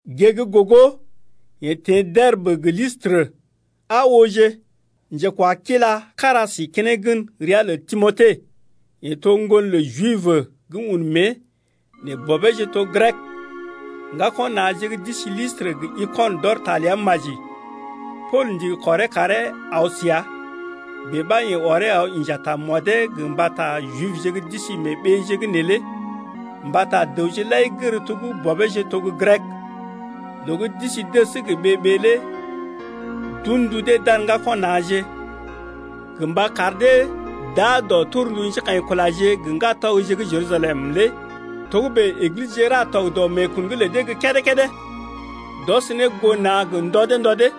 Gée gə́ gogo yeḛ teḛ Derbə gə Listrə. Aa ooje, njekwakila kára si keneŋ gən ria lə Timote. Yeḛ to ŋgon lə Jib gə́ un mée nɛ bɔbeeje to Grek. Ŋgako̰ na̰je gə́ d’isi Listrə gə Ikɔnə d’ɔr ta ləa maji. Pool ndigi kɔree karee aw səa. Bèe ɓa yeḛ ɔree aw inja ta mɔdee gə mbata Jibje gə́ d’isi mee ɓeeje’g neelé, mbata dəwje lai gər to gə́ bɔbeeje to gə́ Grek. Loo gə́ d’isi dəs gə ɓee-ɓee lé d’un ndu dee d’ar ŋgako̰ na̰je gə mba kar dee d’aa dɔ torndu njékaḭkulaje gə ŋgatɔgje gə́ Jerusalem’g lé. Togə́bè Eglisəje ra tɔg dɔ meekun’g lə dee gə́ kédé-kédé, d’ɔs ne goo na̰ gə ndɔ dee ndɔ dee.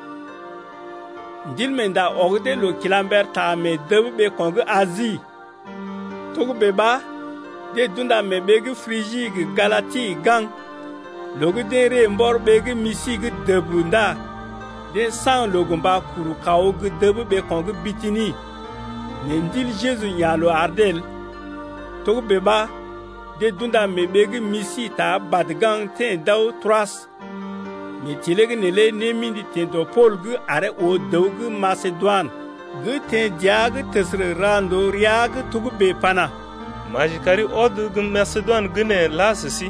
Ndilmeenda ɔg dee loo kila mber ta mee dəb ɓeeko̰ gə́ Asi. Togə́bè ɓa deḛ d’unda mee ɓee gə́ Prigi gə Galati gaŋg. Loo gə́ deḛ ree mbɔr ɓee gə́ Misi’g dəb ndá deḛ saŋg loo gə mba kuru kaw gə́ dəb ɓeeko̰ gə́ Bityni. Nɛ Ndil Jeju ya̰ loo ar dee el. Togə́bè ɓa deḛ d’unda mee ɓee gə́ Misi ta badə gaŋg teḛ d’aw Troas. Mee tilee’g neelé némḭdi teḛ dɔ Pool’g aree oo dəw gə́ Masedoinə gə́ teḛ dəa’g təsərə ra ndòo rəa’g togə́bè pana: Maji kari ɔd gə́ Masedoinə’g nee la sə sí.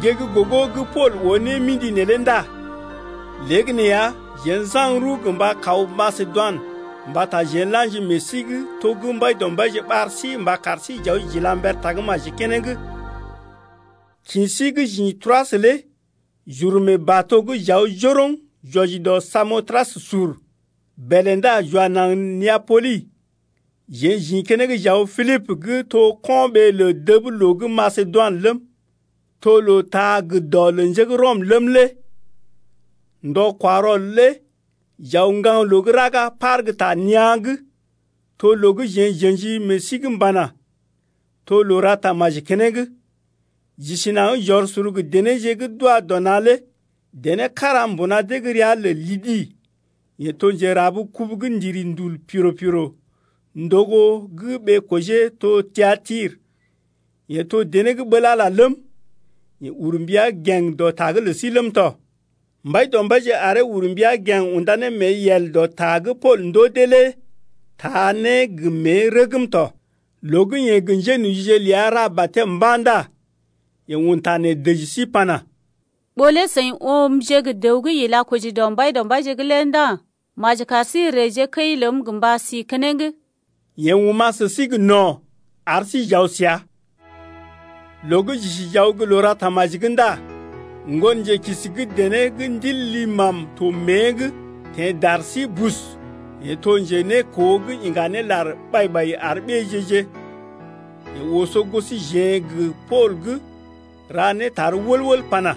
Gée gə́ gogo gə́ Pool oo némḭdi neelé ndá léegəneeya jeḛ n’saŋg rəw gə mba kaw Masedoinə mbata jeḛ n’la̰ji meḛ sí’g to gə́ Mbaidɔmbaije ɓar sí mba kar sí j’aw j’ila mber tagə́maji keneŋ. Kḭ sí gə́ j’ḭ Troas lé j’uru mee bato’g j’aw njoroŋ j’wɔji dɔ Samotrasə sur. Bèlè ndá j’wa naŋg Neapolis. Jeḛ j’ḭ keneŋ j’aw Pilibə gə́ to ko̰ɓee lə dəb loo gə́ Masedoinə ləm, to loo-taa gə dɔ lə njé gə́ Rɔm ləm lé. Ndɔ-kwa-rɔ lé j’aw ŋgaŋloo’g raga par gə́ ta nia̰’g, to loo gə́ jeḛ j’ə̰ji meḛ sí’g m’pana: To loo ra tamaji keneŋ. J’isi naŋg j’ɔr sor gə denéje gə́ d’wa dɔ na̰ lé. Dené kára mbuna dee’g ria lə Lidi, yeḛ to njerab-kubu gə́ ndiri ndul piro-piro ndogo gə́ ɓee-kojee to Tiatirə. Yeḛ to dené gə́ ɓəl Ala ləm, yeḛ ur mbia gèŋ dɔ ta’g lə sí ləm tɔ. Mbaidɔmbaije aree ur mbia gèŋ unda ne mée yel dɔ ta gə́ Pool ndoo dee lé taa ne gə mée rəgm tɔ. Loo gə́ yeḛ gə njénojije ləa ra batɛm mba̰ ndá yeḛ un ta nee dəji sí pana: Ɓó lé seḭ oomje gə́ dəw gə́ ila koji dɔ Mbaidɔmbaije’g lé ndá maji kar sí reeje kəi ləm gə mba sí keneŋ. Yeḛ oma̰ sə sí gə no̰, ar sí j’aw səa. Loo gə́ j’isi j’aw gə́ loo-ra-tamaji ndá ŋgonjelookisi gə́ dené gə́ ndil li-mam to mée’g teḛ dar sí bus, yeḛ to njenékoo gə́ iŋga ne lar ɓai-ɓai ar ɓéeje-je. Yeḛ oso goo síjeḛ gə́ Pool’g ra né tar wəl-wəl pana: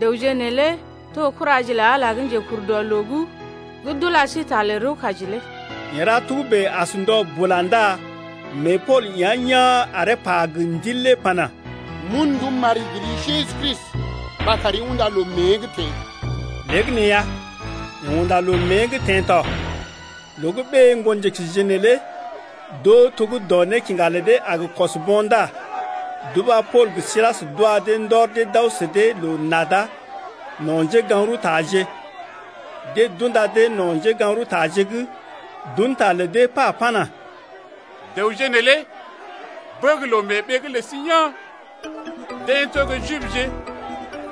Dəwje neelé to kuraje lə Ala gə́ Njekurdɔloo’g gə́ d’ula sí ne ta lə rəw-kaji. Yeḛ ra togə́bè as ndɔ bula ndá mee Pool ea̰ yaa̰ aree pa gə ndil lé pana: M’un ndum m’ari gə ri Jeju Kristi mba kari unda loo mée’g teḛ. Léegəneeya yeḛ unda loo mée’g teḛ tɔ. Loo gə́ ɓé-ŋgon-njelookisije neelé d’oo to gə́ dɔ nékiŋga lə dee a gə kɔs bo̰ ndá d’uba Pool gə Silas d’wa dee ndɔr dee d’aw sə dee loo-nada no̰ njégaŋ-rəwtaje’g. Deḛ d’unda dee no̰ njégaŋ-rəwtaje’g d’un ta lə dee pa pana: Dəwje neelé bəg loo mee ɓee’g lə sí yaa̰. Deḛ to gə́ Jibje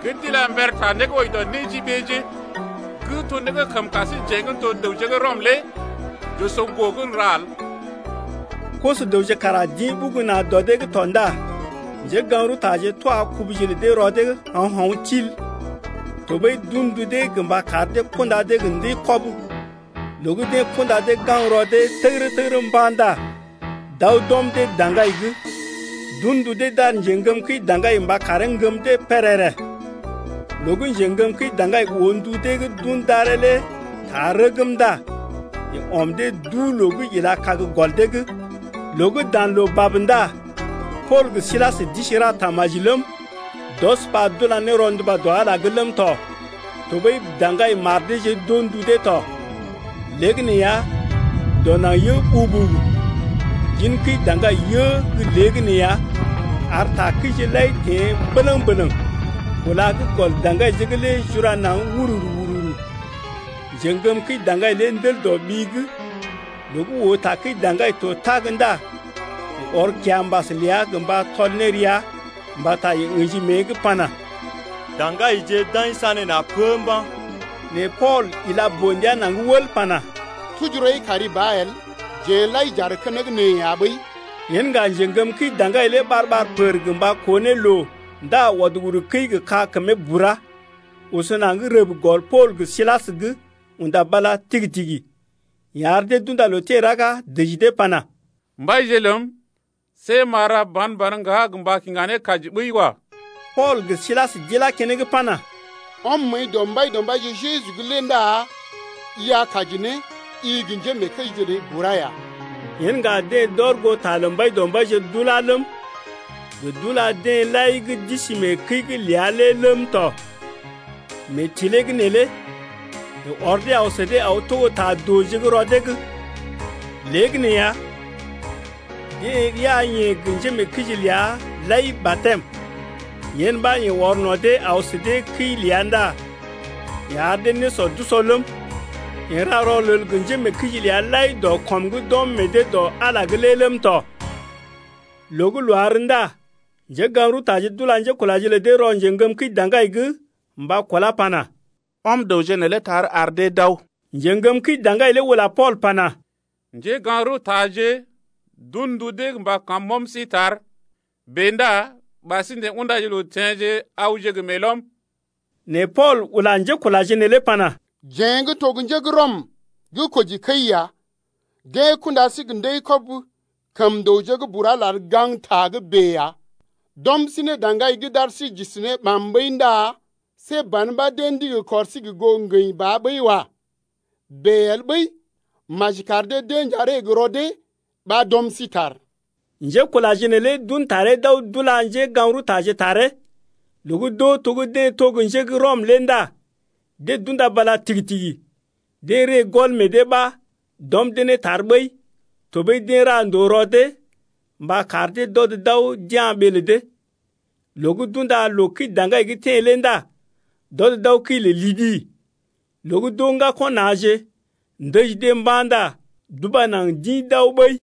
gə́ d’ila mber ta né gə́ wɔji dɔ néjiɓeje gə́ to né gə́ kəm kar síjeḛ gə́ n’to dəwje gə́ Rɔm lé j’oso goo’g n’ra el. Koso-dəwje kara d’ḭ ɓugu na̰ dɔ dee’g tɔ ndá njégaŋ-rəwtaje twa kubuje lə dee rɔ dee’g hao̰-hao̰ til, tɔɓəi d’un ndu dee gə mba kar dee kunda dee gə ndəi-kɔb. Loo gə́ deḛ kunda dee gaŋg rɔ dee təgərə-təgərə mba̰ ndá d’aw d’ɔm dee daŋgai’g. D’un ndu dee d’ar njeŋgəm kəi-daŋgai mba karee ŋgəm dee pèrèrè. Loo gə́ njeŋgəm kəi-daŋgai oo ndu deḛ gə́ d’un d’aree lé taa rəgm ndá yeḛ ɔm dee duu-loo’g ila kag gɔl dee’g. Loo gə́ dan loo bab ndá Pool gə Silas d’isi ra tamaji ləm, d’ɔs pa d’ula ne rɔnduba dɔ Ala’g ləm tɔ tɔɓəi daŋgai mar deeje d’oo ndu dee tɔ. Léegəneeya dɔ naŋg yə ɓugu-ɓugu, gin kəi-daŋgai yə gə́ léegəneeya ar takəije lai teḛ bələŋ-bələŋ. Kula gə́ gɔl daŋgaije’g lé jura naŋg wururu-wururu. Njeŋgəm kəi-daŋgai lé ndel dɔ ɓi’g. Loo gə́ oo takəi-daŋgai to tag ndá yeḛ ɔr kiambas ləa gə mba tɔl ne rəa mbata ə̰ji mée’g pana: Daŋgaije d’aḭ sanéna̰ pə mba̰. Nɛ Pool ila boo-ndia naŋg wəl pana: Tuji rɔi kari ba el, jeḛ lai j’aar keneŋ nee ya ɓəi. Yen ŋga njeŋgəm kəi-daŋgai lé ɓar-ɓar pər gə mba koo ne loo ndá ɔd uru kəi gə kaa kəmee bura, oso naŋg rəb gɔl Pool gə Silas’g unda bala tigi-tigi. Yeḛ ar dee d’unda loo teḛ raga dəji dee pana: Mbaije ləm, see m’a ra ban-ban ŋga gə mba kiŋga ne kaji ɓəi wa. Pool gə Silas d’ilá keneŋ pana: Ɔm məəi dɔ Mbaidɔmbaije Jeju’g lé ndá i a kaji ne, i gə njémeekəije ləi bura ya. Yen ŋga deḛ d’ɔr goo ta lə Mbaidɔmbaije d’ulá ləm, gə d’ula deḛ lai gə́ d’isi mee kəi’g ləa lé ləm tɔ. Mee tilee’g neelé yeḛ ɔr dee aw sə dee aw togo ta dooje gə́ rɔ dee’g. Léegəneeya deḛ rəa-yeḛ gə njémeekəije ləa lai batɛm. Yen ɓa yeḛ ɔr no̰ dee aw sə dee kəi ləa ndá yeḛ ar dee nésɔ d’usɔ ləm, yeḛ ra rɔlel gə njémeekəije ləa lai dɔ kɔm gə́ d’ɔm meḛ dee dɔ Ala’g lé ləm tɔ. Loo gə́ loo àr ndá njégaŋ-rəwtaje d’ula njékulaje lə dee rɔ njeŋgəm kəi-daŋgai’g mba kulá pana: Ɔm dəwje neelé tar ar dee d’aw. Njeŋgəm kəi-daŋgai lé ula Pool pana: Njégaŋ-rəwtaje d’un ndu dee mba kam m’ɔm sí tar. Bèe ndá ɓasinè undaje loo teḛje awje gə meelɔm. Nɛ Pool ula njékulaje neelé pana: Jeḛ gə́ n’to gə́ njé gə́ Rɔm gə́ kojikəi ya, deḛ d’unda sí gə ndəi-kɔb kəm dəwje bura lal gaŋgta gə́ bèe ya, d’ɔm sí ne daŋgai’g d’ar sí j’isi ne ɓam ɓəi ndá see ban ɓa deḛ ndigi kɔr sí gə goo ŋgəḭ ba ɓəi wa. Bèe el ɓəi. Maji kar dee-deḛ nja ree gə rɔ dee ɓa d’ɔm sí tar ɓəi. Njékulaje neelé d’un taree d’aw d’ula njégaŋ-rəwtaje taree. Loo gə́ d’oo to gə́ deḛ to gə́ njé gə́ Rɔm lé ndá deḛ d’unda bala tigi-tigi. Deḛ ree gɔl meḛ dee ɓa d’ɔm dee ne tar ɓəi tɔɓəi deḛ ra ndòo rɔ dee’g mba kar dee d’ɔd d’aw d’ya̰ ɓee lə dee. Loo gə́ d’unda loo kəi-daŋgai’g teḛ lé ndá d’ɔd d’aw kəi lə Lidi. Loo gə́ d’oo ŋgako̰ na̰je, ndəji dee mba̰ ndá d’uba naŋg d’ḭ d’aw ɓəi tɔ.